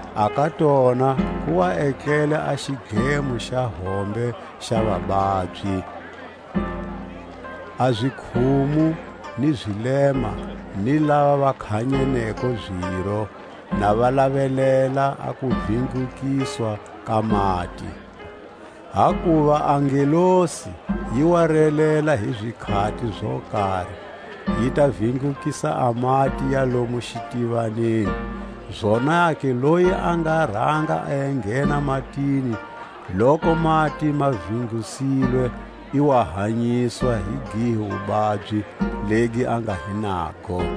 A ka tona ku wa etlele a xidlemo xa hombe xa vababyi: a zikhumu, ni zilema, ni lava va khanyeneko ziro, na va lavelela a kuvindlukiswa ka mati. Hakuva a ngelosi yi wa relela hi zikhati zo kari, yi ta vindlukisa a mati ya lomu xitivaneni; zonake loyi a nga ranga a enghena matini loku mati ma vindlusilwe, i wa hanyiswa hi gihi wubabyi legi a nga hi nago.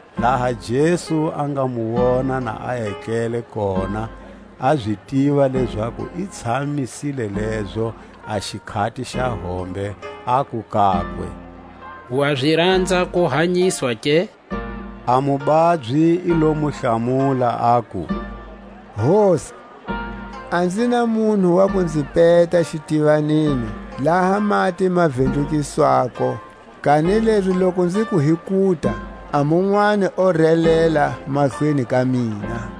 Laha Jesu a nga mu wona na a etlele kona, a zi tiva lezaku i tshamisile lezo a xikhati xa hombe, aku kakwe: Wa zi ranza ku hanyiswa ke? A mubabyi i lo mu hlamula, aku: Hosi, a nzi na munhu wa ku nzi peta xitivaneni laha mati ma vindlukiswa-ko; kanilezi loku nziku hi kuta, a munwani o relela mahlweni ka mina.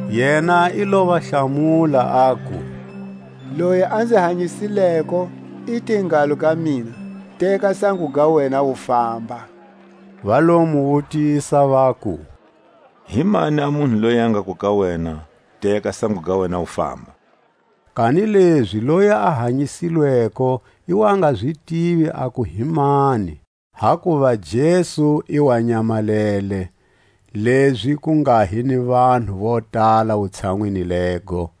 Yena i lo va hlamula, aku: Loyi a nzi hanyisileko, i te ngalo ka mina: Teka sango ga wena, u famba. Va lo mu wutisa, vaku: Hi mani a munhu loyi a ngaku ka wena: Teka sango ga wena, u famba? Kanilezi loyi a hanyisilweko i wa nga zi tivi aku hi mani; hakuva Jesu i wa nyamalele, lezi ku nga hi ni vanhu vo tala wutshanwini lego.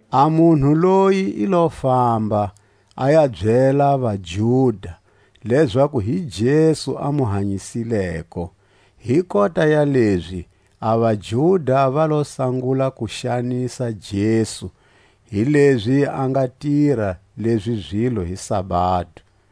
A munhu loyi i lo famba, a ya byela vaJuda, lezaku hi Jesu a mu hanyisileko. Hi kota ya lezi a vaJuda va lo sangula ku xanisa Jesu, hilezi a nga tira lezi zilo hi sabado.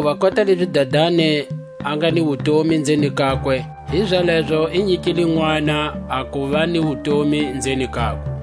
Hakuva kota lezi Dadani a nga ni wutomi nzeni kakwe, hizalezo i nyikile Nʼwana a kuva ni wutomi nzeni kakwe.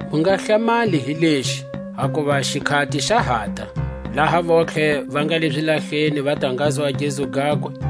Mu nga hlamali hi lexi, hakuva xikhati xa hata, laha vontlhe va nga le zilahleni va ta ngazwa a gezu gakwe,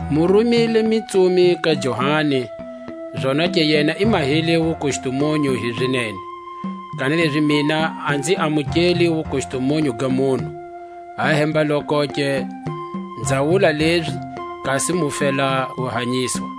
Mu rumile mitsumi ka Johani, zonake yena i mahile wukustumunyu hi zinene. Kanilezi mina a nzi amukeli Wukustumunyu ga munhu; ahemba-lokoke nza wula lezi kasi mu fela ku hanyiswa.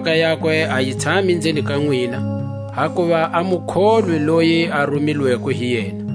ni mhaka yakwe a yi tshami nzeni ka nwina, hakuva a mu kholwi loyi a rumilweko hi yena.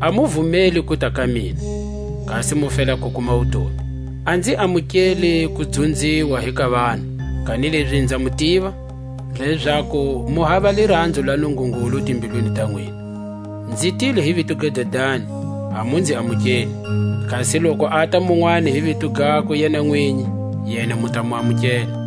A mu vumeli kuta ka mina, kasi mu fela ku kuma wutomi. A nzi amukeli kudzunziwa hi ka vanhu; kanilezi nza mu tiva, lezaku mu hava liranzo la Nungungulu timbilwini ta nwina. Nzi tile hi vito ga Dadani, a mu nzi amukeli; kasi loku ata munwani hi vito gakwe yena nwinyi, yena mu ta mu amukela.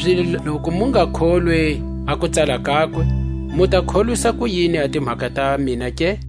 Kanilezi loku mu nga kholwi a kutsala kakwe, mu ta kholwisa kuyini a timhaka ta mina ke?